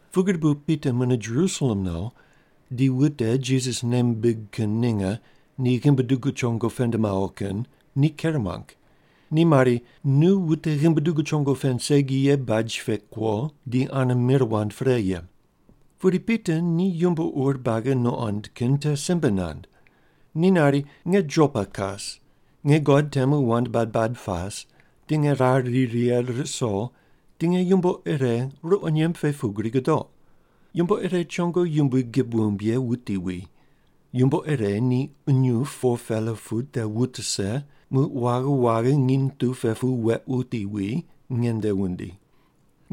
Pugri bu Pita mune Jerusalem no, di wute Jisas nei mimbig kin ninge ni ghimbi dugu chongo pend mawo kin ni ker muang. Ni mari, “Nu wute ghimbi dugu chongo pend segi ye baj pe kuo di ane mir wand pre ye!” Pudi Pita ni yumbo ur buagi nuqond kin te simbe nand. Ni nari, “Nge Jopa kas, nge God temu wand bad bad pas, di nge rar ri righe ruso, di nge yumbo ire ruqo nyemb pe pugri gudoq. Yumbo ire chongo yumbui gib wumb ye wuti wi. Yumbo ire ni qunyup 4-pela pu te wut rise, muq waghi waghi nginy tu pe pu weq wuti wi, nge nde wundi.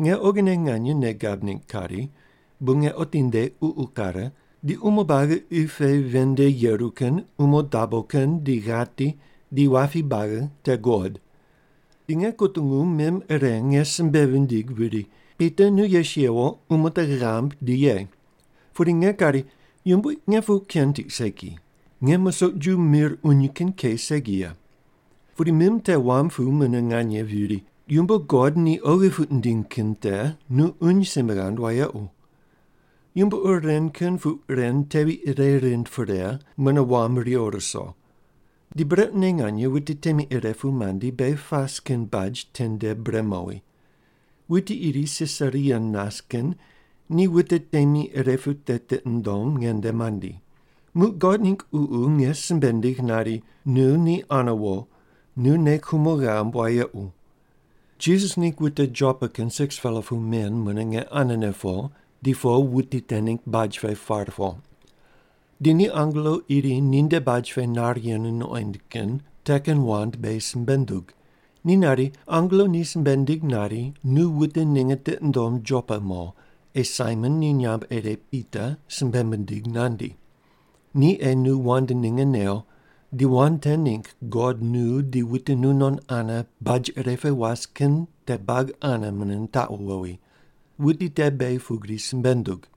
Nge oghine nganye nei gab ningg kari, bu nge otinde ququ kare, di umo buagi qi pe ven nde yeru kin, umo dabo kin, di ghati, di wapi buagi te guqod. Di nge kutungu mim ire nge simbe vindigh viri, ‘Pita, nu yes yewo, umo te ghambui, di ye.’ “Pudi nge kari, ‘Yumbui, nge puq ken tiq segi! Nge musoq ju mir uny kin ke segi ye.’ “Pudi mim te wam pu mune nganye viri, ‘Yumbo God ni oghi puq nindiny kin te nu uny simbe ghand wayequ.’ “Yumbo ur ren kin puq ren tevi ire rind pre, mune wam riwo ruso. Di brequne nganye wute temi ire pu mandi, beghi pas kin baj tende bre mowi. Wuti iri Sisaria nas kin ni wute temi ire pu te tiqi nundom nge nde mandi. Muq God ningg Ququ nge simbe nindigh nari, ‘Nu ni ane wo. Nu nei kumo ghamb wayequ.’ Jisas ningg wute Jopa kin 6-pela pu men mune nge anene po, di po wuti te ningg baj pe par po. Di ni angelo iri ninde baj pe nar yenu nuqoind kin te kin wand beghi simbe nundug. Ni nari, angelo ni simbe nindig nari, ‘Nu wute ninge tiqi ndom Jopa mo, ei Saimon ni nyamb ire Pita simbe mindig nandi. Ni ei nu wand ninge new, di wand te ningg God nu di wute nu non ane baj ire pe was kin te buagi ane mune nitaqu wowi.’ Wuti te beghi pugri simbe nundug.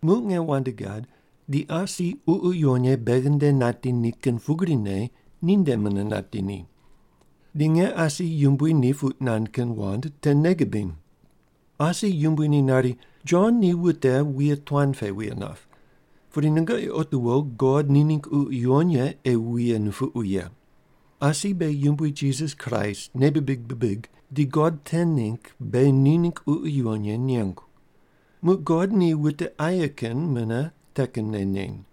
“Muq nge wand gad, di asi Ququ Yuwon Ye beghi nde nati ni kin pugrine ninde mune nati ni. Di nge asi Yumbui ni puq nand kin wand te nei gibiny. Asi Yumbui ni nari, ‘Jon ni wute wuye tuan pe wuye nap, pudi nungoqi otiwo God ni ningg Ququ Yuwon Ye ei wuye nupuqu ye.’ Asi beghi Yumbui Jisas Kraist nei bibig bibig di God te ningg beghi ni ningg Ququ Yuwon Ye nengu. Muq God ni wute aye kin mune te kinne neny.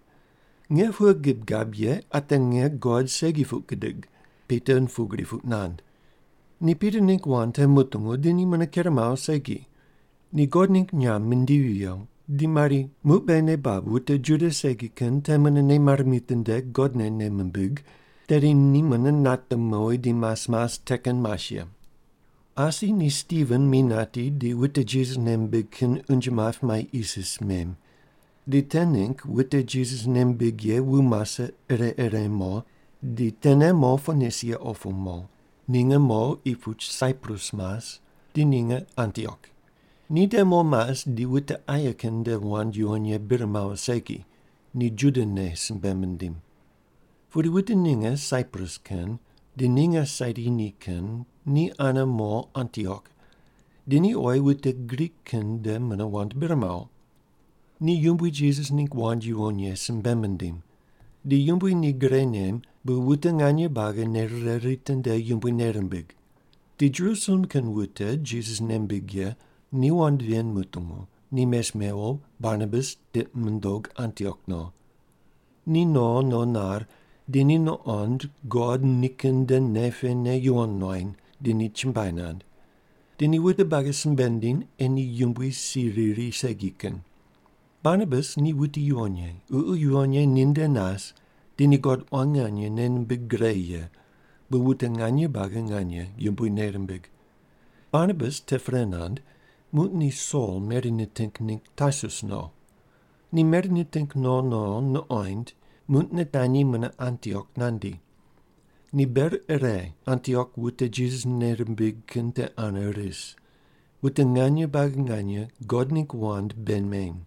Nge pughe gib gab ye ate nge God segi puq gidig?” Pita pugri puq nand. Ni Pita ningg wand te mutungu, di ni mune ker mawo segi. Ni God ningg nyamb mindivi viyo, di mari, “Muq beghi nei bab wute Juda segi kin te mune nei mare mitinde God ne nei mimbig, tedi ni mune nate mowi di mas mas te kin mas ye.” Asi ni Stiven mi nati di wute Jisas nei mimbig kin unje map mai isis mem. Di te ningg wute Jisas nei mimbig ye wu mase ire ire mo, di tene mo Ponisia opu mo, ninge mo qi puch Saiprus mas, di ninge Antiok. Ni te mo mas di wute aye kin nde wand yuwon ye bir mawo segi, ni Juda ne simbe mindim. Pudi wute ninge Saiprus kin di ninge Sairini kin ni ane mo Antiok, di ni oyi wute Grik kin nde mune wand bir mawo. Ni Yumbui Jisas ningg wand yuwon ye simbe mindim. Di Yumbui ni gre nem, bu wute nganye buagi nei rire ritinde Yumbui nei rimbig. Di Jerusalem kin wute Jisas nei mimbig ye ni wand ven mutungu, ni mes mewo Barnabas tiqi mundog Antiok no. Ni no no nar, di ni nuqond God nikin nde nei pene yuwon nuany, di ni chumbuai nand. Di ni wute buagi simbe nindiny ei ni Yumbui si riri segi kin. Barnabas ni wuti yuwon ye, Ququ Yuwon Ye ni nde nas di ni God quan nganye nei nimbig gre ye, bu wute nganye buagi nganye Yumbui nei rimbig. Barnabas te pre nand, muq ni Sol meri niting ningg Tarsus no. Ni meri niting no no nuqoind, muq nitanyi mune Antiok nandi. Ni ber ire Antiok wute Jisas nei rimbig kin te ane ris, wute nganye buagi nganye God ningg wand bei meny.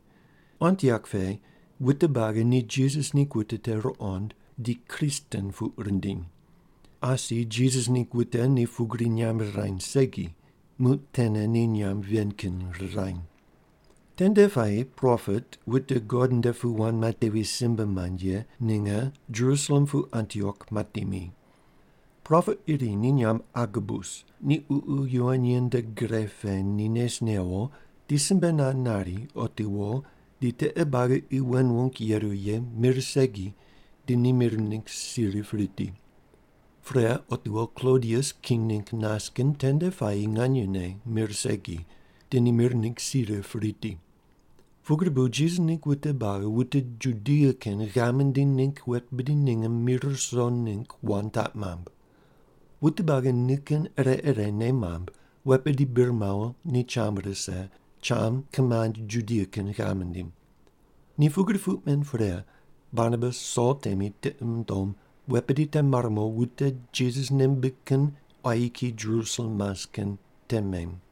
Antiok pe wute buagi ni Jisas ningg wute te ruqond di “Kristen” puq rindiny. Asi Jisas ningg wute ni pugri nyamb rirany segi, muq tene ni nyamb ven kin rirany. Tende puayi propet, wute God nde pu wand matevi simbe mand ye, ninge Jerusalem pu Antiok mati mi. Propet iri ni nyamb Agabus, ni Ququ Yuwon Ye nde gre pe ni nes newo di simbe nand nari, otiwo di tiqe buagi qi wen wung yeru ye mir segi di ni mir ningg si rip riti. (Pre, otiwo Klodius king ningg nas kin tende puayi nganyene mir segi, di ni mir ningg si rip riti.) Pugri bu Jisas ningg wute buagi wute Judia kin ghav mindiny ningg wet bidi ninge mi ruso ningg wand taq mamb. Wute buagi nikin ire ire nei mamb, wet bidi bir mawo ni cham rise, cham kimand Judia kin ghav mindim. Ni pugri puq men pre, Barnabas Sol temi tiqi mundom wet bidi te mare mo wute Jisas nei mimbig kin quayi kiyi Jerusalem mas kin te mem.